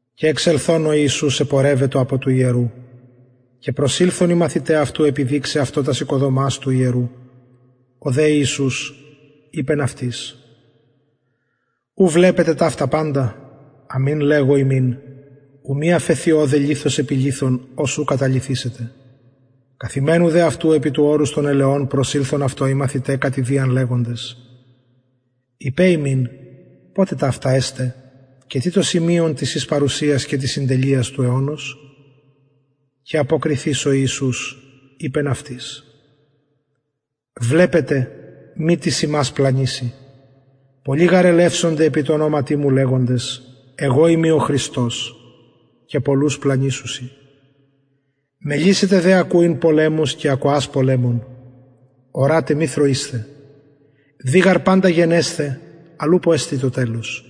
και εξελθων ο ιησους επορευετο απο του ιερου και προσηλθον οι μαθηται αυτου επιδειξαι αυτω τας οικοδομας του ιερου ο δε ιησους ειπεν αυτοις ου βλεπετε παντα ταυτα αμην λεγω υμιν ου μη αφεθη ωδε λιθος επι λιθον ος ου καταλυθησεται καθημενου δε αυτου επι του ορους των ελαιων προσηλθον αυτω οι μαθηται κατ ιδιαν λεγοντες ειπε ημιν ποτε ταυτα εσται και τι το σημειον της σης παρουσιας και της συντελειας του αιωνος και αποκριθεις ο ιησους ειπεν αυτοις βλεπετε μη τις υμας πλανηση πολλοι γαρ ελευσονται επι τω ονοματι μου λεγοντες εγω ειμι ο χριστος και πολλους πλανησουσιν μελλησετε δε ακουειν πολεμους και ακοας πολεμων ορατε μη θροεισθε δει γαρ παντα γενεσθαι αλλ ουπω εστιν το τελος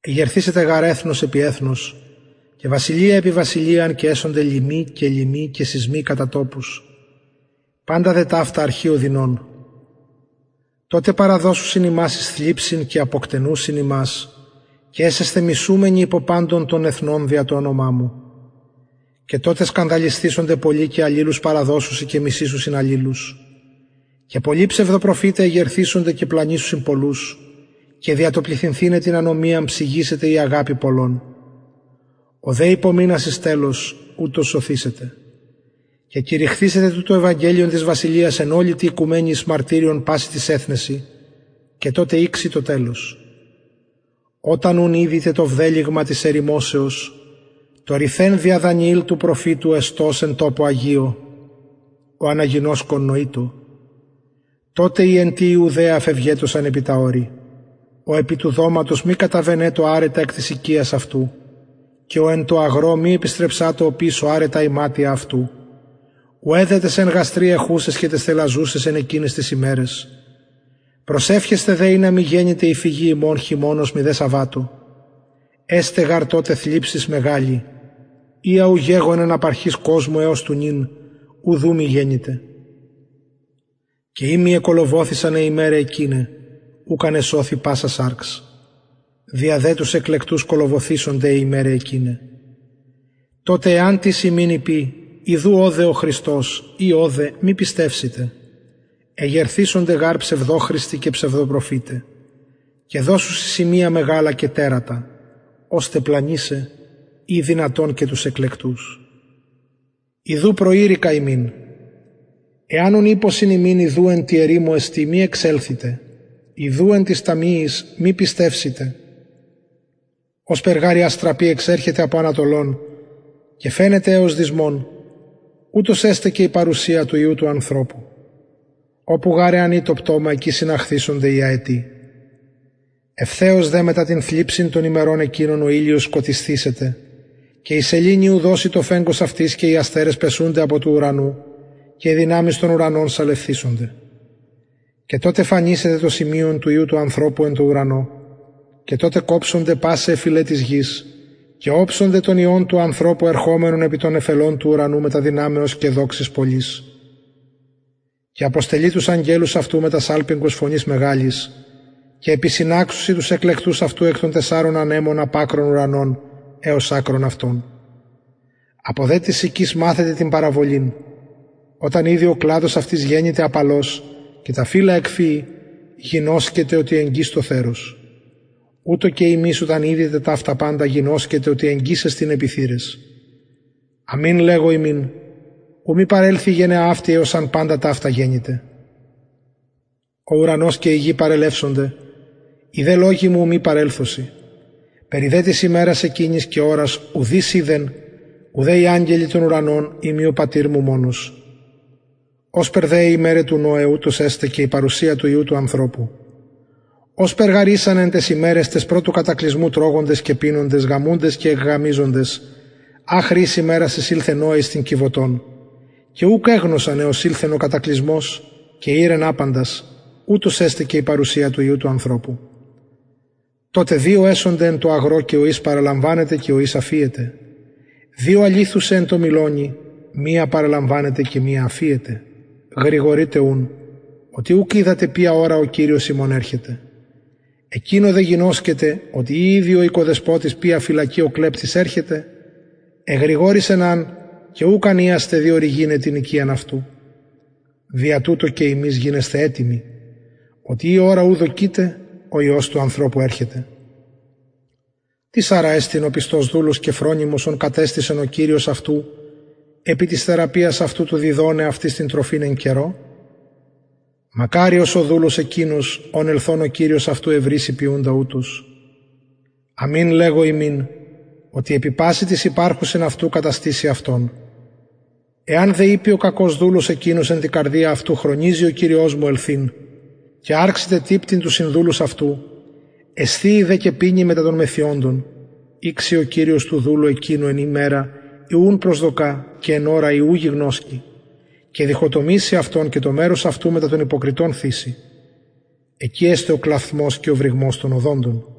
εγερθησεται γαρ εθνος επι εθνος και βασιλεια επι βασιλειαν και εσονται λιμοι και λοιμοι και σεισμοι κατα τοπους παντα δε ταυτα αρχη ωδινων τοτε παραδωσουσιν υμας εις θλιψιν και αποκτενουσιν υμας και εσεσθε μισουμενοι υπο παντων των εθνων δια το ονομα μου και τοτε σκανδαλισθησονται πολλοι και αλληλους παραδωσουσιν και μισησουσιν αλληλους και πολλοι ψευδοπροφηται εγερθησονται και πλανησουσιν πολλους και δια το πληθυνθηναι την ανομιαν ψυγησεται η αγαπη των πολλων ο δε υπομεινας εις τελος ουτος σωθησεται και κηρυχθησεται τουτο το ευαγγελιον της βασιλειας εν ολη τη οικουμενη εις μαρτυριον πασιν τοις εθνεσιν και τοτε ηξει το τελος οταν ουν ιδητε το βδελυγμα της ερημωσεως το ρηθεν δια δανιηλ του προφητου εστως εν τοπω αγιω ο αναγινωσκων νοειτω τοτε οι εν τη ιουδαια φευγετωσαν επι τα ορη ο επι του δωματος μη καταβαινετω αραι τα εκ της οικιας αυτου και ο εν τω αγρω μη επιστρεψατω οπισω αραι τα ιματια αυτου ουαι δε ταις εν γαστρι εχουσαις και ταις θηλαζουσαις εν εκειναις ταις ημεραις προσευχεσθε δε ινα μη γενηται η φυγη υμων χειμωνος μηδε σαββατω εσται γαρ τοτε θλιψις μεγαλη οια ου γεγονεν απ αρχης κοσμου εως του νυν ουδ ου μη γενηται και ει μη εκολοβωθησαν αι ημεραι εκειναι ουκ αν εσωθη πασα σαρξ δια δε τους εκλεκτους κολοβωθησονται αι ημεραι εκειναι τοτε εαν τις υμιν ειπη ιδου ωδε ο χριστος η ωδε μη πιστευσητε εγερθησονται γαρ ψευδοχριστοι και ψευδοπροφηται και δωσουσιν σημεια μεγαλα και τερατα ωστε πλανησαι ει δυνατον και τους εκλεκτους ιδου προειρηκα υμιν εαν ουν ειπωσιν υμιν ιδου εν τη ερημω εστιν μη εξελθητε ιδου εν τοις ταμειοις μη πιστευσητε ωσπερ γαρ η αστραπη εξερχεται απο ανατολων και φαινεται εως δυσμων ουτως εσται και η παρουσια του υιου του ανθρωπου οπου γαρ εαν η το πτωμα εκει συναχθησονται οι αετοι ευθεως δε μετα την θλιψιν των ημερων εκεινων ο ηλιος σκοτισθησεται και η σεληνη ου δωσει το φεγγος αυτης και οι αστερες πεσουνται απο του ουρανου και αι δυναμεις των ουρανων σαλευθησονται και τοτε φανησεται το σημειον του υιου του ανθρωπου εν τω ουρανω και τοτε κοψονται πασαι αι φυλαι της γης και οψονται τον υιον του ανθρωπου ερχομενον επι των νεφελων του ουρανου μετα δυναμεως και δοξης πολλης και αποστελει τους αγγελους αυτου μετα σαλπιγγος φωνης μεγαλης και επισυναξουσιν τους εκλεκτους αυτου εκ των τεσσαρων ανεμων απ ακρων ουρανων εως ακρων αυτων απο δε της συκης μαθετε την παραβολην οταν ηδη ο κλαδος αυτης γενηται απαλος και τα φυλλα εκφυη γινωσκετε οτι εγγυς το θερος ουτως και υμεις οταν ιδητε ταυτα παντα γινωσκετε οτι εγγυς εστιν επι θυραις αμην λεγω υμιν ου μη παρελθη η γενεα αυτη εως αν παντα ταυτα γενηται ο ουρανος και η γη παρελευσονται οι δε λογοι μου ου μη παρελθωσιν περι δε της ημερας εκεινης και ωρας ουδεις οιδεν ουδε οι αγγελοι των ουρανων ει μη ο πατηρ μου μονος ωσπερ δε αι ημεραι του νωε ουτως εσται και η παρουσια του υιου του ανθρωπου ωσπερ γαρ ησαν εν ταις ημεραις ταις προ του κατακλυσμου τρωγοντες και πινοντες γαμουντες και εκγαμιζοντες αχρι ης ημερας εισηλθεν νωε εις την κιβωτον και ουκ εγνωσαν εως ηλθεν ο κατακλυσμος και ηρεν απαντας ουτως εσται και η παρουσια του υιου του ανθρωπου τοτε δυο εσονται εν τω αγρω ο εις παραλαμβανεται και ο εις αφιεται δυο αληθουσαι εν τω μυλωνι μια παραλαμβανεται και μια αφιεται γρηγορειτε ουν οτι ουκ οιδατε ποια ωρα ο κυριος υμων ερχεται εκεινο δε γινωσκετε οτι ει ηδει ο οικοδεσποτης ποια φυλακη ο κλεπτης ερχεται εγρηγορησεν αν και ουκ αν ειασεν διορυγηναι την οικιαν αυτου δια τουτο και υμεις γινεσθε ετοιμοι οτι η ωρα ου δοκειτε ο υιος του ανθρωπου ερχεται τις αρα εστιν ο πιστος δουλος και φρονιμος ον κατεστησεν ο κυριος αυτου επι της θεραπειας αυτου του διδοναι αυτοις την τροφην εν καιρω μακαριος ο δουλος εκεινος ον ελθων ο κυριος αυτου ευρησει ποιουντα ουτως αμην λεγω υμιν οτι επι πασιν τοις υπαρχουσιν αυτου καταστησει αυτον εαν δε ειπη ο κακος δουλος εκεινος εν τη καρδια αυτου χρονιζει ο κυριος μου ελθειν και αρξηται τυπτειν τους συνδουλους εσθιειν δε και πινειν μετα των μεθυοντων ηξει ο κυριος του δουλου εκεινου εν ημερα η ου προσδοκα και εν ωρα η ου γινωσκει και διχοτομησει αυτον και το μερος αυτου μετα των υποκριτων θησει εκει εσται ο κλαυθμος και ο βρυγμος των οδοντων